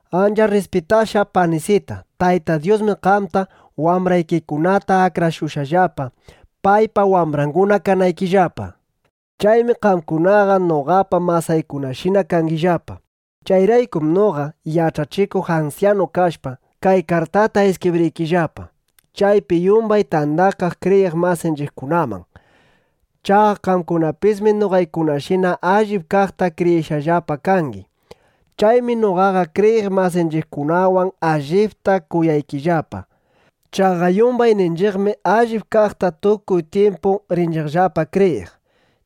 Ancha rrispitashqa panisita, Tayta Dyusmi qamta, wambraykikunata akrashushqallapa, paypa wambranguna kanaykillapa. Chaymi qamkunaqa noqapa masaykunashina kangillapa. Chayraykum noqa yach'achikuq ansyanu kashpa, kay kartata iskibriykillapa chaypi yumbay tandakaq kriyiq masinchiqkunaman. Chaqa qamkunapismi noqaykunashina allip kaqta kriyishqallapa kangi. Chaymi noqaqa kriyiq masinchiqkunawan allipta kuyaykillapa. Chaqa yumbayninchiqmi allip kaqta tukuy tyimpu rinchiqllapa kriyiq.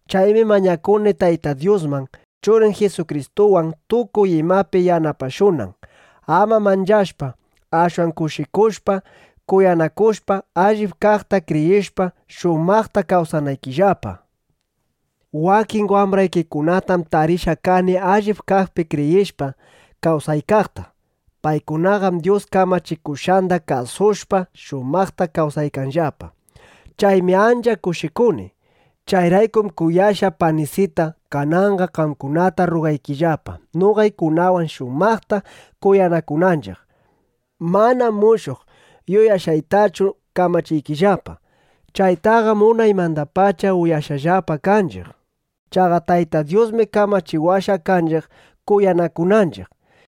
Chaymi mañakuni Tayta Dyusman, Churin Jisukristuwan tukuy imapi yanapashunan, ama manchashpa, ashwan kushikushpa, kuyanakushpa, allip kaqta kriyishpa, shumaqta kawsanaykillapa. Wakin wambraykikunatam tarishqa kani allip kaqpi kriyishpa, kawsaykaqta. Paykunaqam Dyus kamachikushqanda kasushpa, shumaqta kawsaykanllapa. Chaymi ancha kushikuni. Chayraykum kuyashqa panisita, kananqa qamkunata rrugaykillapa, noqaykunawan shumaqta kuyanakunanchiq. Manam mushuq yuyashqaytachu kamachiykillapa. Chaytaqam unaymandapacha uyashqallapa kanchiq. Chaqa Tayta Dyusmi kamachiwashqa kanchiq kuyanakunanchiq.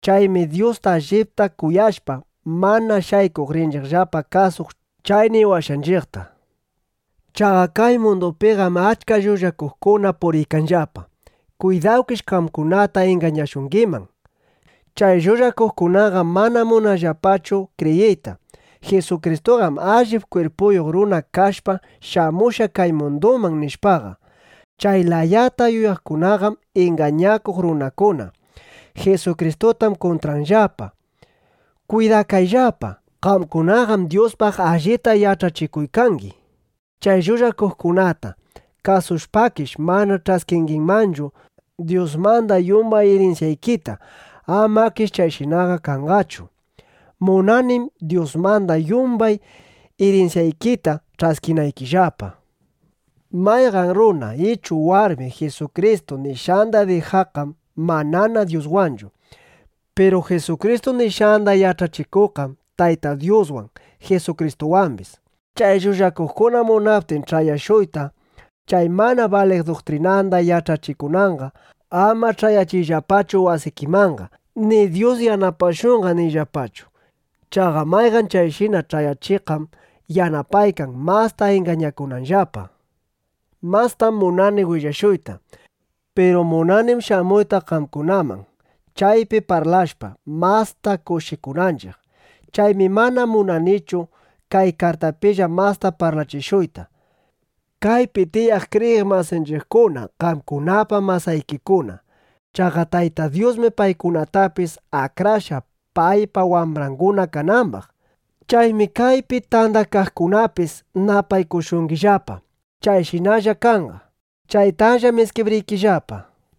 Chaymi Dyusta allipta kuyashpa, mana shaykuq rinchiqllapa kasuq chay niwashqanchiqta. Chaqa kay mundupiqam achka llullakuqkuna puriykanllapa. Kwidawkish qamkunata ingañashungiman. Chay llullakuqkunaqam mana munanllapachu kriyiyta: Jisukristuqam allip kwirpuyuq runa kashpa, shamushqa kay munduman, nishpaqa. Chay layata yuyaqkunaqam ingañakuq runakuna. Jisukristutam kuntranllapa. ¡Kwidakayllapa! Qamkunaqam Dyuspaq allita yach'achikuykangi. Chay llullakuqkunata kasushpakish, mana ch'askingimanchu Dyusmanda yumban irinsyaykita. Amakish chayshinaqa kanqachu. Munanim Dyusmanda yumbay irinsyaykita ch'askinaykillapa. Mayqan runa ichu warmi Jisukristu nishqanda dijaqqam manana Dyuswanchu. Piru Jisukristu nishqanda yach'achikuqqam Tayta Dyuswan, Jisukristuwambis. Chay llullakuqkuna munaptin ch'ayashuyta, chay mana baliq duktrinanda yach'achikunanqa, ama ch'ayachiyllapachu wasikimanqa ni “Dyus yanapashunqa” niyllapachu. Chaqa mayqan chayshina ch'ayachiqqam yanapaykan, masta ingañakunanllapa. Mastam munani willashuyta. Piru munanim shamuyta qamkunaman, chaypi parlashpa, masta kushikunanchiq. Chaymi mana munanichu kay kartapilla masta parlachishuyta. Kaypi tiyaq kriyiq masinchiqkuna qamkunapa masaykikuna. Chaqa Tayta Dyusmi paykunatapis akrashqa, paypa wambranguna kanambaq. Chaymi kaypi tandakaqkunapis napaykushungillapa. Chayshinalla kanqa. (Chaytallam iskibriykillapa.)